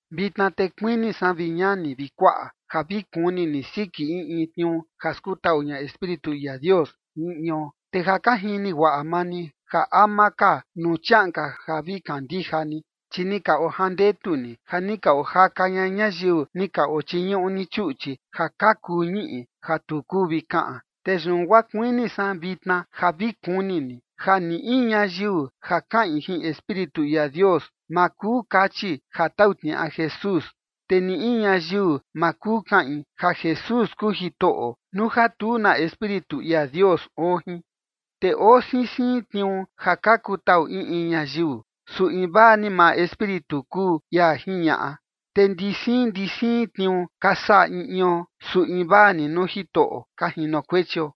Vitna te kuini san, vi ñani vi kuaꞌa, ja vi kuni ni siki in in tniuu ja skutaꞌu ña Espíritu ia Dios jin in ion. Te ja ka jini guaꞌa maa ni ja ama ka nuu chiaꞌan ka ja vi kandija ni, chi ni ka ojandetu ni ja ni ka ojaka ña ñayiu ni ka ochiñuꞌu ni chuꞌchi ja ka kuu ñiꞌi ja tu kuu vi kaꞌan. Te yun guaa kuini san vitna ja vi kuni ni ja ni in ñayiu ja kaꞌin jin Espíritu ia Dios ma kuu kachi ja tau tniaꞌa Jesús, te ni in ñayiu ma kuu kaꞌin ja Jesús kuu Jitoꞌo nuu ja tu na Espíritu ia Dios oo jin. Te oo siin siin tniuu ja ka kutaꞌu in in ñayiu, su invaa ni maa Espíritu kuu ia jiñaꞌa. Te ndi siin ndi siin tniuu ka saꞌa in ion, su invaa ni nuu Jitoꞌo ka jinokuechio.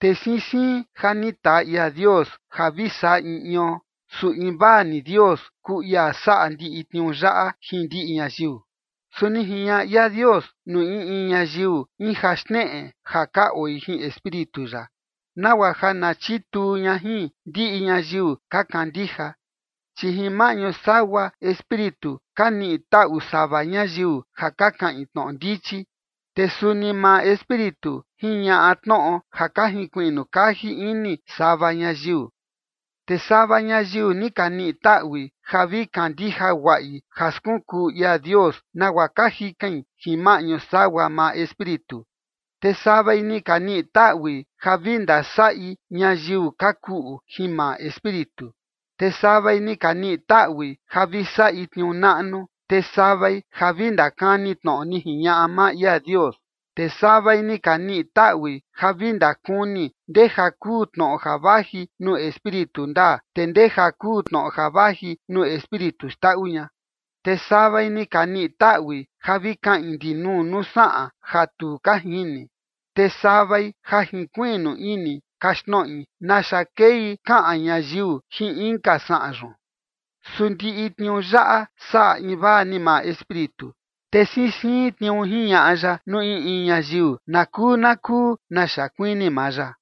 Te siin siin ja ni taa ia Dios ja vi saꞌa in ion, su invaa ni Dios kuu ia saꞌa ndiꞌi tniuu yaꞌa jin ndiꞌi ñayiu. Su ni jiñaꞌa ia Dios nuu in in ñayiu in ja xneꞌe ja ka oi jin Espíritu ya, nagua ja na chituu ña jin ndiꞌi ñayiu ka kandija. Chi jin maꞌñu sagua Espíritu ka niꞌi taꞌu sava ñayiu ja ka kaꞌin tnoꞌo ndichi, te suni maa Espíritu jiñaꞌa tnoꞌo ja ka jinkuiꞌnu kaji ini sava ñayiu. Te sava ñayiu ni ka niꞌi taꞌui ja vi kandija guaꞌi ja skunkuu ia Dios nagua ka jikain jin maꞌñu sagua maa Espíritu, te savai ni ka niꞌi taꞌui ja vi ndasaꞌi ñayiu ka kuꞌu jin maa Espíritu. Te savai ni ka niꞌi taꞌui ja vi saꞌi tniuu naꞌnu, te savai ja vi ndakani tnoꞌo ni jiñaꞌa maa ia Dios. Te savai ni ka niꞌi taꞌui ja vi ndakuni ndeja kuu tnoꞌo ja vaji nuu Espíritu ndaa, te ndeja kuu tnoꞌo ja vaji nuu espíritu xndaꞌu ña. Te savai ni ka niꞌi taꞌui ja vi kaꞌin ndinuu nuu saꞌan ja tu ka jini, te savai ja jinkuiꞌnu ini kaxtnoꞌi naxa kei kaꞌan ñayiu jin inka saꞌan yun. Su ndiꞌi tniuu yaꞌa saꞌa invaa ni maa Espíritu, te siin siin tniuu jiñaꞌa ya nuu in in ñayiu na kuu na kuu naxa kuini maa ya.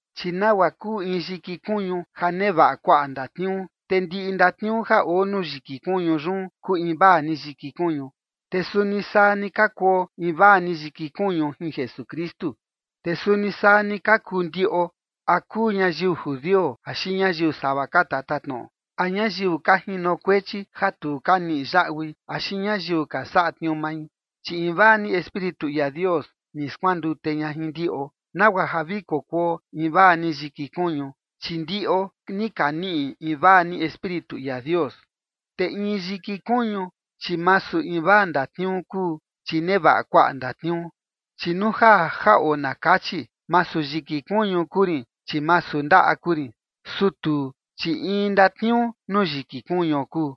Chi nagua kuu in yiki kuñu ja nevaꞌa kuaꞌa ndatniuu, te ndiꞌi ndatniuu ja oo nuu yiki kuñu yun kuu invaa ni yiki kuñu, te suni saa ni ka kuo invaa ni yiki kuñu jin Jesukristu. Te suni saa ni ka kuu ndiꞌo, a kuu ñayiu judio axi ñayiu sava ka tatatnoꞌo, a ñayiu ka jinokuechi ja tu ka niꞌi yaꞌui axi ñayiu ka saꞌa tniuu mai, chi invaa ni Espíritu ia Dios ni skuandute ña jin ndiꞌo, nagua ja vi kokuo invaa ni yiki kuñu, chi ndiꞌo ni ka niꞌi invaa ni Espíritu ia Dios. Te in yiki kuñu, chi masu invaa ndatniuu kuu, chi nevaꞌa kuaꞌa ndatniuu. Chi nuu ja jaꞌo na kachi: “Masu yiki kuñu kuu rin, chi masu ndaꞌa kuu rin”, su tuu, chi in ndatniuu nuu yiki kuñuo kuu.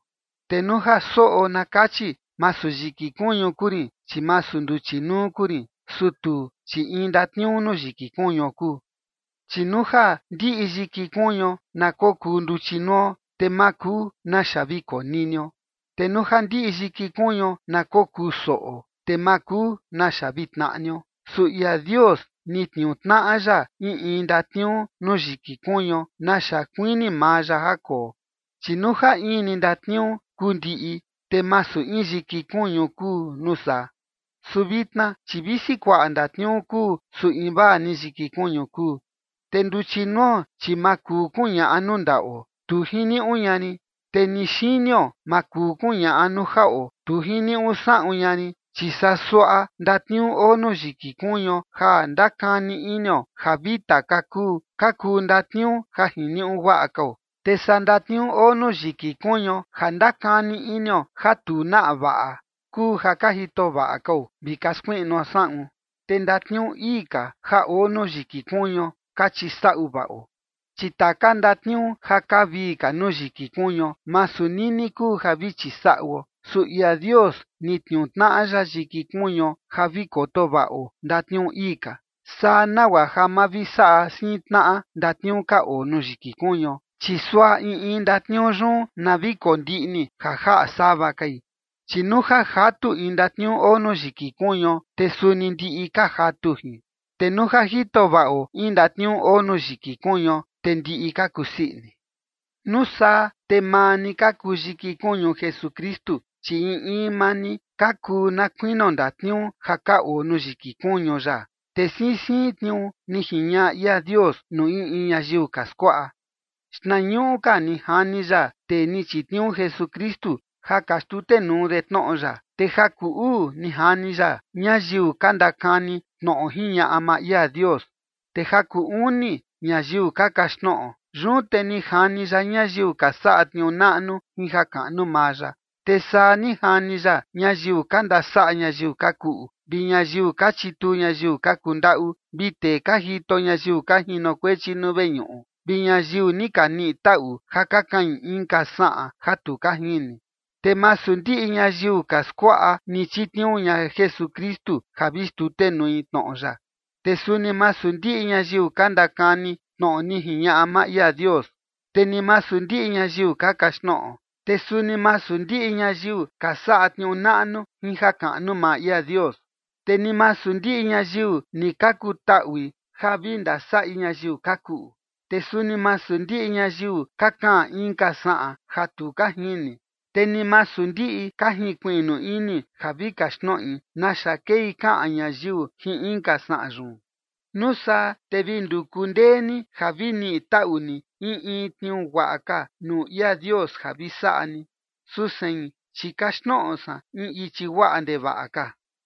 Te nuu ja soꞌo na kachi: “Masu yiki kuñu kuu rin, chi masu nduchi nuu kuu rin”, su tuu, chi in ndatniuu nuu yiki kuñuo kuu. Chi nuu ja ndiꞌi yiki kuñuo na kokuu nduchi nuo, te ma kuu naxa vi koninio. Te nuu ja ndiꞌi yiki kuñuo na kokusoꞌo, te ma kuu naxa vi tnaꞌnio. Su ia Dios ni tniuu tnaꞌa ya in in ndatniuu nuu yiki kuñuo naxa kuini maa ya ja koo. Chi nuu ja in ni ndatniuu kuu ndiꞌi, te masu in yiki kuñu kuu nuu saa. Su vitna, chi visi kuaꞌa ndatniuu kuu, su invaa ni yiki kuñu kuu. Te nduchi nuo, chi ma kuu kuñaꞌa nuu ndaꞌo: “Tu jiniuꞌu ña rin”. Te ni xinio ma kuu kuñaꞌa nuu jaꞌo: “Tu jiniuꞌu saꞌun ña rin”. Chi saa suaꞌa ndatniuu oo nuu yiki kuñuo ja ndakani inio ja vita ka kuu, ka kuu ndatniuu ja jiniuꞌu guaꞌa kao. Te saa ndatniuu oo nuu yiki kuñuo ja ndakani inio ja tu naꞌa vaꞌa kuu ja ka jito vaꞌa kao vi ka skuiꞌnuo saꞌun. Te ndatniuu ii ka ja oo nuu yiki kuñuo ka chisaꞌu vaꞌo. Chi taka ndatniuu ja kaa vii ka nuu yiki kuñuo masu nini kuu ja vi chisaꞌuo, su ia Dios ni tniuu tnaꞌa ya yiki kuñuo ja vi koto vaꞌo ndatniuu ii ka. Saa nagua ja ma vi saꞌa siin tnaꞌa ndatniuu ka oo nuu yiki kuñuo, chi suaꞌa in in ndatniuu yun na vi kondiꞌni ja jaꞌa sava kai. Chi nuu ja jatu in ndatniuu oo nuu yiki kuñuo, te suni ndiꞌi ka jatu jin. Te nuu ja jito vaꞌo in ndatniuu oo nuu yiki kuñuo, te ndiꞌi ka kusii ini. Nuu saa, te maa ni ka kuu yiki kuñu Jesukristu, chi in in maa ni ka kuu na kuinio ndatniuu ja ka oo nuu yiki kuñu ya. Te siin siin tniuu ni jiñaꞌa ia Dios nuu in in ñayiu ka skuaꞌa. Xnañuꞌu ka ni jani ya tee ni chitniuu Jesukristu ja ka xtutenuu de tnoꞌo ya. Te ja kuu uu ni jani ya ñayiu ka ndakani tnoꞌo jiñaꞌa maa ia Dios. Te ja kuu uni ñayiu ka kaxtnoꞌo. Yun te ni jani ya ñayiu ka saꞌa tniuu naꞌnu jin jakaꞌnu maa ya. Te saa ni jani ya ñayiu ka ndasaꞌa ñayiu ka kuꞌu, vi ñayiu ka chituu ñayiu ka kundaꞌu, vi tee ka jito ñayiu ka jinokuechi nuu veñuꞌu, vi ñayiu ni ka niꞌi taꞌu ja ka kaꞌin inka saꞌan ja tu ka jini. Te masu ndiꞌi ñayiu ka skuaꞌa ni chitniuu ña Jesukristu ja vi xtutenui tnoꞌo ya. Te suni masu ndiꞌi ñayiu ka ndakani tnoꞌo ni jiñaꞌa maa ia Dios. Te ni masu ndiꞌi ñayiu ka kaxtnoꞌo. Te suni masu ndiꞌi ñayiu ka saꞌa tniuu naꞌnu jin jakaꞌnu maa ia Dios. Te ni masu ndiꞌi ñayiu ni ka kutaꞌui ja vi ndasaꞌi ñayiu ka kuꞌu. Te suni masu ndiꞌi ñayiu ka kaꞌan inka saꞌan ja tu ka jini, te ni masu ndiꞌi ka jinkuiꞌnu ini ja vi kaxtnoꞌi naxa kei kaꞌan ñayiu jin inka saꞌan yun. Nuu saa te vi nduku ndee ni ja vi niꞌi taꞌu ni in in tniuu guaꞌa ka nuu ia Dios ja vi saꞌa ni. Su sein, chi kaxtnoꞌo san in ichi guaꞌa ndevaꞌa ka.